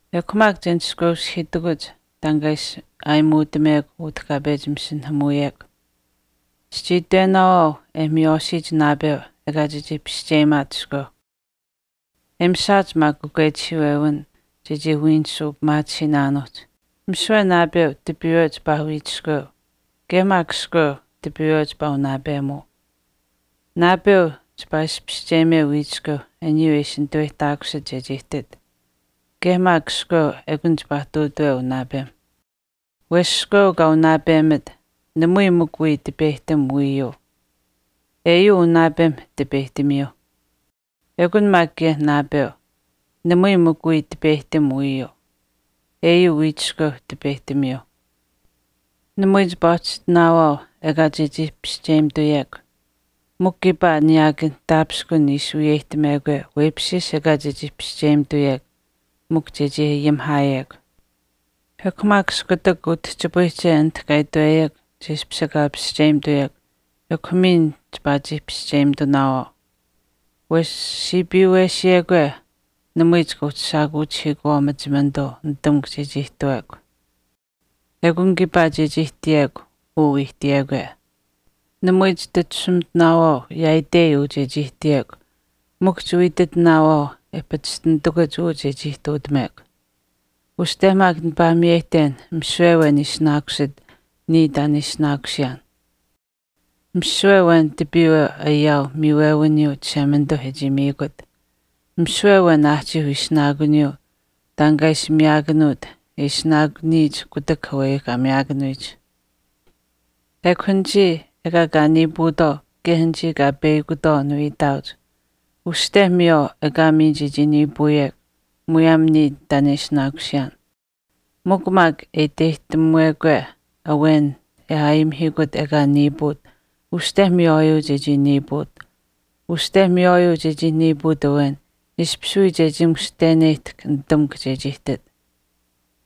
Ekw maak che nishkweushihiitakuch taan kaa ishi aayimuutamekw utah kaa pechi masinahamuuyekw. Chichii itwenaawaau e miywaashiyich naapeu ekaa chechii pischeyimaat iskweuh. E mishaach maak kakwechihiiwewin chechii wiinisuu pimaatisiinaanuuhch, misiwe naapeu tipiiwe chipaa wiichiskweuu, kaye maak iskweu tipiiwe chipaa unaapemuu. Naapeu chipaa ishi pischeyimeu wiichiskweu aniyuu e ishi nitaweyihtaakusit chechii ihtit. Kaye maak iskweu ekun chipaa ihtuutuweu unaapem. Wesh iskweu kaa unaapemit, namui mikw wiya tipeyihtam wiiyuu. Eyuu unaapemh tipeyihtamiyuu. Ekun maak kaye naapeu, namui mikw wiya tipeyihtam wiiyuu. Eyuu wiichiskweu tipeyihtamiyuuh. Namui chipaa uhchi ihtinaawaau ekaa chechii pischeyimituyekw. Mikw kiipaa niyaakan taapishkun ishi wiyeyihtamekwe weipishchiish ekaa chechii pischeyimituyekw mikw chechii ayimihaayekw. Ekw maak iskutak utihchipayihche anit kaa itweyekw che ishpish ekaa pischeyimituyekw ekw miin chipaa chii pischeyimitunaawaau. Wesh siipiiwesiyekwe namui chika uhchi shaakuuchihiikuwaau machimanituu nitamukw chechii ihtuwekw. Ekun kiipaa chechii ihtiyekw uu wii ihtiyekwe. Namui chititashumitinaawaau yaaitei uu chechii ihtiyekw mikw chiwii ititinaawaau e pachishtinitakuch uu chechii ihtuutamekw. Uste maak nipaa miyeyihten misiwe awen ishinaakusit niya taan e ishinaakusiyaan. Misiwe awen tipiiwe ayaau miiwewiniyuu Chishemanituuh e chii miikut, misiwe awen aahchiiuh ishinaakuniyuu taan kaa ishi miyaakanuut e ishinaakuniyich kutak aweyuuh kaa miyaakanuyich. Ekw anichii ekaa kaa niipuutwaau kaye anichii kaa peyakutwaau niwii itaauch. Uste miywaau ekaa miin chechii niipuuyekw muyaam niya taan e ishinaakusiyaan. Mikw maak e iteyihtamukwe awen e aayimihiikut ekaa niipuut uste miywaayuu chechii niipuut. Uste miywaayuu chechii niipuut awen ishpish wii chechii mushteneyihtahkw nitamukw chechii ihtit.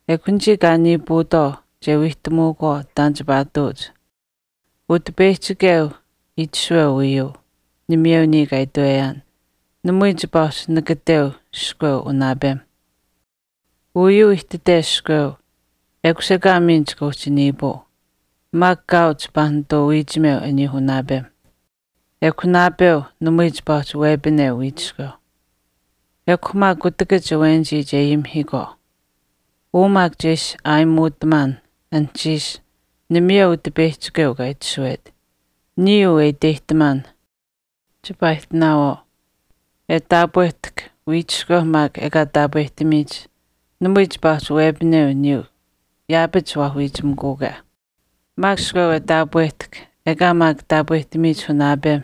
Ekw anichii kaa niipuutwaau che wiihtamuukwaau taan chipaa ihtuuch. Utipeyihchikeu itashuweu uyuu, namayeu niya uu kaa itweyaan. Namui chipaa uhchi nakateu iskweu unaapemh. Uyuu ihtite iskweu, ekush ekaa miin chika uhchi niipuu. Maak kaau chipaa nituu wiichimeu aniyuuh unaapem. Ekw naapeu namui chipaa uhchi wepineu wiichiskeu. Ekw maak kutakach awenich che ayimihiikwaau. Uu maak che ishi aayimuutamaan anuhchiish namayeu Utipeyihchikeu kaa itashuwet. Niya uu e iteyihtamaan chipaa ihtinaawaau. E ihtaakwe chiichishaanuu e taapwehtahk wiichiskweu maak ekaa taapwehtamiyich namui chipaa uhchi wepineu aniyuu yaapach waa wiichimikuukwe. Maak iskweu e taapwehtahk ekaa maak taapwehtamiyich unaapem,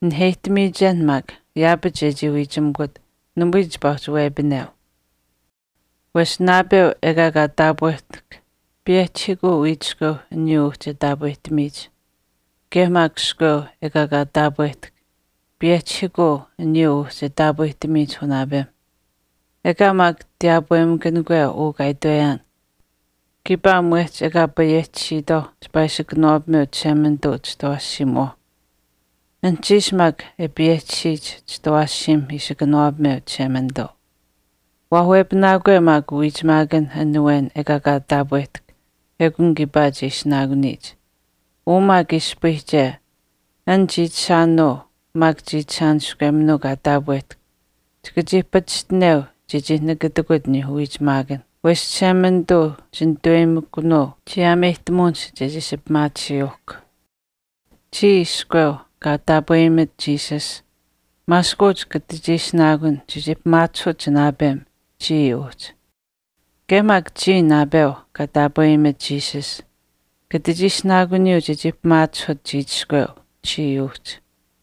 naheyihtamiyichen maak yaapach chechii wiichimikut namui chipaa uhchi wepineu. Wesh naapeu ekaa kaa taapwehtahk payehchihiikuu wiichiskweuh aniyuu uhchi e taapwehtamiyich. Kaye maak iskweu ekaa kaa taapwehtahk payehchihiikuu aniyuuh uhchi e taapwehtamiyich unaapem. Ekaa maak tiyaapwemakanikwe uu kaa itweyaan kiipaa mwehch ekaa payehchisiitwaau chipaa ishi kanawaapameu Chishemanituu chitawaashiimuwauh. Anuhchiish maak e payehchisiyich chitawaashiimh ishi kanawaapameu Chishemanituu. Waa wepinaakwe maak uwiichimaakan an awen ekaa kaa taapwehtahk ekun kiipaa che ishinaakuniyich. Uu maak ispayihche, an chiichishaanuu maak chiichishaaniskweminuu kaa taapwehtahk chika chii pachishtineu chechii nakatikut aniyuuh uwiichimaakan. Wesh Chishemanituu chinitaweyimikunuu chiyaameyihtamuwinihch chechii ishi pimaatisiyuuhkw. Chiya iskweu kaa taapweyimat Jesus, maaskuuch kata chii ishinaakun chechii pimaachihut chinaapem chii uhchi, kaye maak chiya naapeu kaa taapweyimat Jesus, kata chii ishinaakuniyuu chechii pimaachihut chiichiskweu chiya uhchi.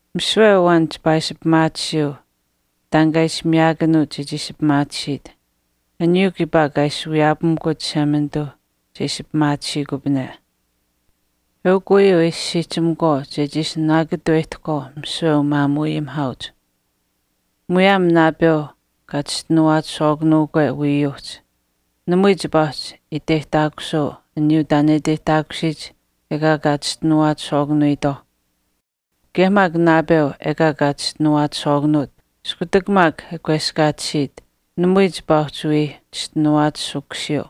Misiwe awen chipaa ishi pimaatisiyuu taan kaa ishi miyaakanuut chechii ishi pimaatisiit, aniyuu kiipaa kaa ishi wiyaapamikut Chishemanituuh che ishi pimaatisiikupane. Eukw uyuu e ishi siihchimakwaau chechii ishi nanaakatuweyihtahkwaau misiwe umaamuuayimihaauch. Muyaam naapeu kaa chischinuwaachishwaakanuukwe wiiyuuhch, namui chipaa uhchi iteyihtaakusuu aniyuu taan e iteyihtaakusiyich ekaa kaa chischinuwaachishwaakanuwiitwaauh. Kaye maak naapeu ekaa kaa chischinuwaachishwaakanuut iskutak maak e kweskaatisiit, namui chipaa uhchi wii chischinuwaachishukusiyuu.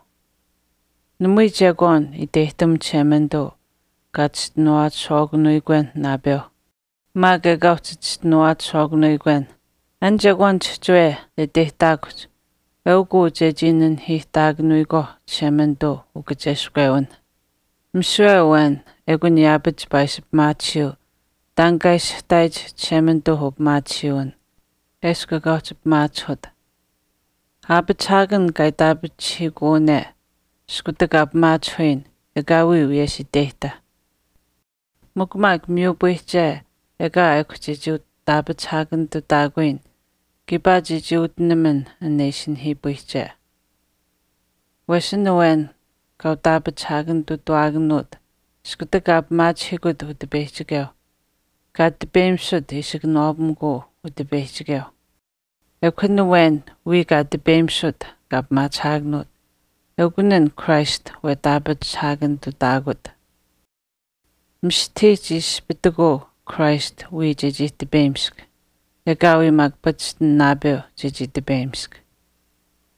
Namui chekwaan iteyihtam Chishemanituu kaa chischinuwaachishwaakanuwiikwenh naapeuh maak ekaa uhchi chischinuwaachishwaakanuwiikwenh. An chekwaan chihchiwe e iteyihtaakuhch eukuu chechii nanihiihtaakanuyikwaauh Chishemanituu ukacheskwewinh. Misiwe awen ekun yaapach chipaa ishi pimaatisiyuu taan kaa ishihtaayich Chishemanituuh upimaatisiiwin eshkw ekaa uhchi pimaachihut. Aapachihaakan kaa itaapachihiikuwane iskutak kaa pimaachihuyin ekaawii wiyesh iteyihta. Mikw maak miyupayihche ekaa ekw chechii utaapachihaakanitutaakuyin kiipaa chechii utinaman an ishi nihiipayihche. Wesh an awen kaa utaapachihaakanitutuuwaakanuut iskutak kaa pimaachihiikut Utipeyihchikeuh, kaa tipeyimisut ishi kanawaapamikuu Utipeyihchikeuh, ekw an awen wiya kaa tipeyimisut kaa pimaachihaakanuut eukun an Christ wetaapachihaakanitutaakut. Mistahii chii ispitikuu Christ wiya chechii tipeyimisk. Ekaawii maak pachishtin naapeu chechii tipeyimisk.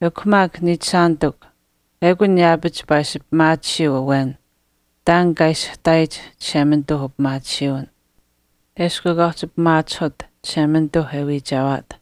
Ekw maak niichishaanitikw, ekun yaapach chipaa ishi pimaatisiyuu awen taan kaa ishihtaayich Chishemanituuh upimaatisiiwin eshkw ekaa uhchi pimaachihut Chishemanituuh e wiichewaat.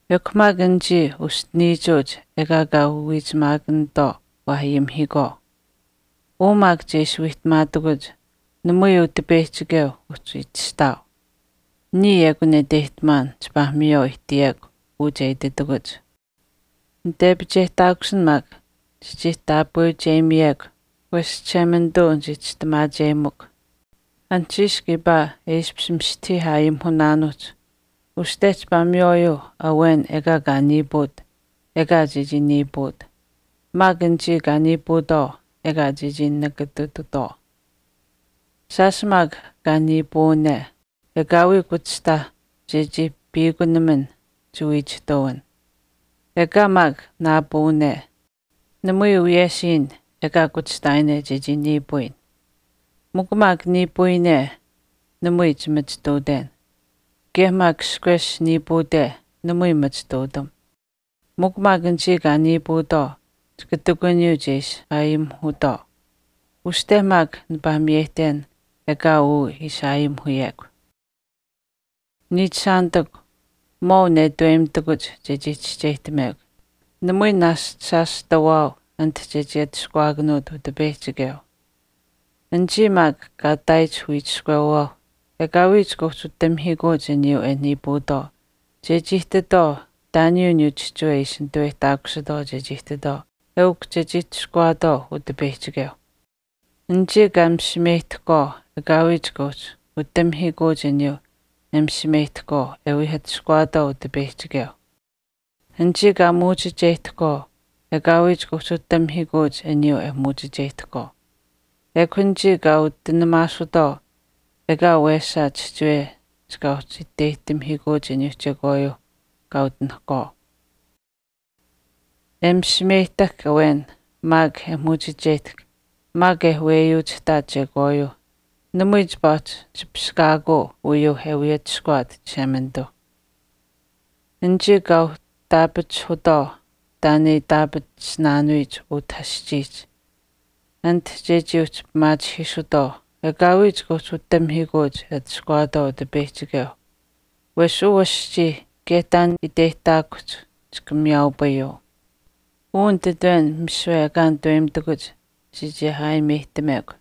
Ekw maak anichii uschiniichuuch ekaa kaa uwiichimaakanitwaau waa ayimihiikwaau. Uu maak che ishi wiihtamaatakuch namui Utipeyihchikeu uhchi itashuweu. Niya ekun e iteyihtamaan chipaa miywaau ihtiyekw uu che ititakuch. Nitepicheyihtaakusin maak chechii taapweucheyimiyekw wesh Chishemanituu nichii chistimaacheyimikw. Anuhchiish kiipaa e ishpish mistahii aayimuhunaanuuhch uste chipaa miywaayuu awen ekaa kaa niipuut ekaa chechii niipuut, maak anichii kaa niipuutwaau ekaa chechii nakatitutwaau. Shaash maak kaa niipuuwane, ekaawii kuchihtaa chechii piikunaman chiwiichihtuwin. Ekaa maak naapuuwane, namui wiyesh iin ekaa kuchihtaayine chechii niipuuyin. Mikw maak niipuuyine namui chimachituuten. Kaye maak ishkwesh niipuute namui machituutam. Mikw maak anichii kaa niipuutwaau chika ihtakuniyuu che ishi aayimuhutwaau. Uste maak nipaa miyeyihten ekaa uu ishi aayimuhuyekw. Niichishaanitikw, maau netaweyimitakuch chechii chischeyihtamekw. Namui naashch shaash tawaau anit chechii atushkuwaakanuut Utipeyihchikeu. Anichii maak kaa ihtaayich wiichiskweuwaau ekaawii chika uhchi utamihiikuuch aniyuu e niipuutwaau chechii ihtitwaau taan aniyuuh chihchiwe e ishi nituweyihtaakusitwaau chechii ihtitwaau eukw chechii atushkuwaatwaau Utipeyihchikeuh. Anichii kaa misimeyihtahkwaau ekaawii chika uhchi utamihiikuuch aniyuu e misimeyihtahkwaau e wii atushkuwaatwaau Utipeyihchikeuh. Anichii kaa muuchicheyihtahkwaau ekaawii chika uhchi utamihiikuuch aniyuu e muuchicheyihtahkwaau. Ekw anichii kaa utinaasutwaau ekaa wesaa chihchiwe chika uhchi iteyihtamihiikuuch aniyuuh chekwaayuu kaa utinahkwaau. E misimeyihtahk awen maak e muuchicheyihtahk maak e weyuuchihtaat chekwaayuuh namui chipaa uhchi chipishkaakuu uyuuh e wii atushkuwaat Chishemanituuh. Anichii kaa uhtaapachihutwaau taan e itaapatisinaanuyich utah aschiihch anit chechii uhchi pimaachihiisutwaau ekaawii chika uhchi utamihiikuuch e atushkuwaatwaau Utipeyihchikeuh wesh uu aschii kaye taan e iteyihtaakuhch chika miyaaupayuu. Uu misiwe nititwen ekaa nitaweyimitakuch chechii aayimeyihtamekw.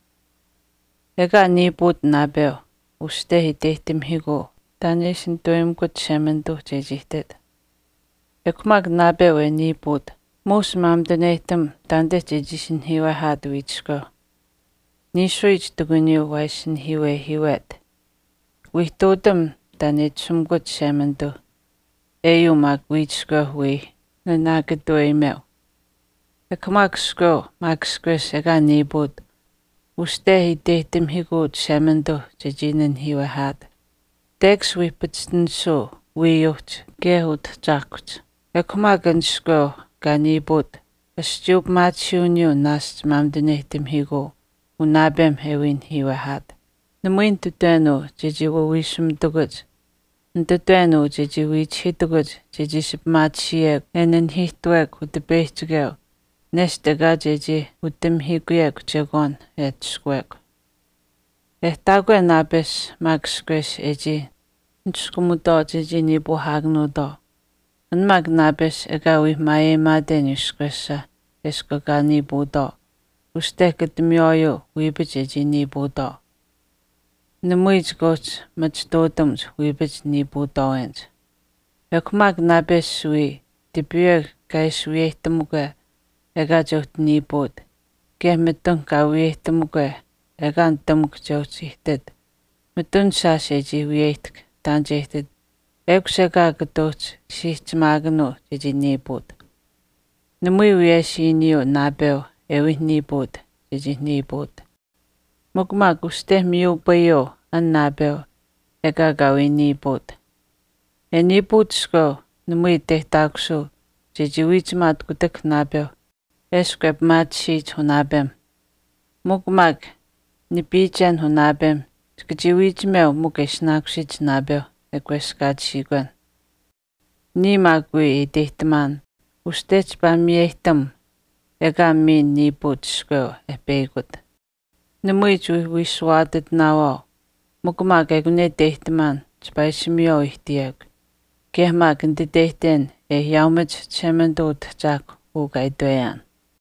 Ekaa niipuut naapeu, uste iteyihtamihiikuu taan e ishi nitaweyimikut Chishemanituu chechii ihtit. Ekw maak naapeu e niipuut muush maamituneyihtam taanite chechii ishi nanihiiwehaat wiichiskweu. Niishuyich ihtakuniyuu waa ishi nanihiiwehiiwet, wii ihtuutam taan e itashumikut Chishemanituu eyuu maak wiichiskweu wii nanaakatuweyimeu. Ekw maak iskweu maak ishkwesh ekaa niipuut uste iteyihtamihiikuu Chishemanituu chechii nanihiiwehaat, tekash wii payehtisiyuu wiiyuuhch kaye utahchaahkuhch. Ekw maak an iskweu kaa niipuut aschiiyuu pimaatisiiwiniyuu naashch maamituneyihtamihiikuu unaapem e wii nanihiiwehaat. Namui nititwen uu chechii waawiishumitakuch, nititwen uu chechii wiichihiitakuch chechii ishi pimaatisiyekw e nanihiihtuwekw Utipeyihchikeu nesht ekaa chechii utamihiikuyekw chekwaan e atushkuwekw. E ihtaakwe naapesh ekw maak ishkwesh e chii niskumutwaau chechii niipuuhaakanuutwaau, an maak naapesh ekaa wii maayeyimaate aniyuu ishkwesha eshkw ekaa niipuutwaau uste kata miywaayuu wiipach chechii niipuutwaau. Namui chika uhchi machituutamuch wiipach niipuutwaawenich. Ekw maak naapesh wiya tipiiwe kaa ishi wiyeyihtamukwe ekaa che uhchi niipuut kaye mitun kaa wiyeyihtamukwe ekaa nitamukw che uhchi ihtit, mitun shaash e chii wiyeyihtahk taan che ihtit ekush ekaa kata uhchi siihchimaakanuu chechii niipuut. Namui wiyesh iiniyuu naapeu e wii niipuut chechii niipuut, mikw maak uste miyupayiyuu an naapeu ekaa kaa wii niipuut. E niipuut iskweu namui iteyihtaakusuu chechii wiichimaat kutak naapeu eshkw e pimaatisiyich unaapem. Mikw maak nipiichen unaapemh chika chii wiichimeu mikw e ishinaakusiyich naapeu e kweskaatisiikwen. Niya maak wii e iteyihtamaan uste chipaa miyeyihtam ekaa miin niipuut iskweu e peyakut. Namui chiwii wiishuwaatitinaawaau mikw maak ekun e iteyihtamaan chipaa ishi miywaau ihtiyekw kaye maak nititeyihten e ayaaumach Chishemanituu Utahchaahkwa uu kaa itweyaan.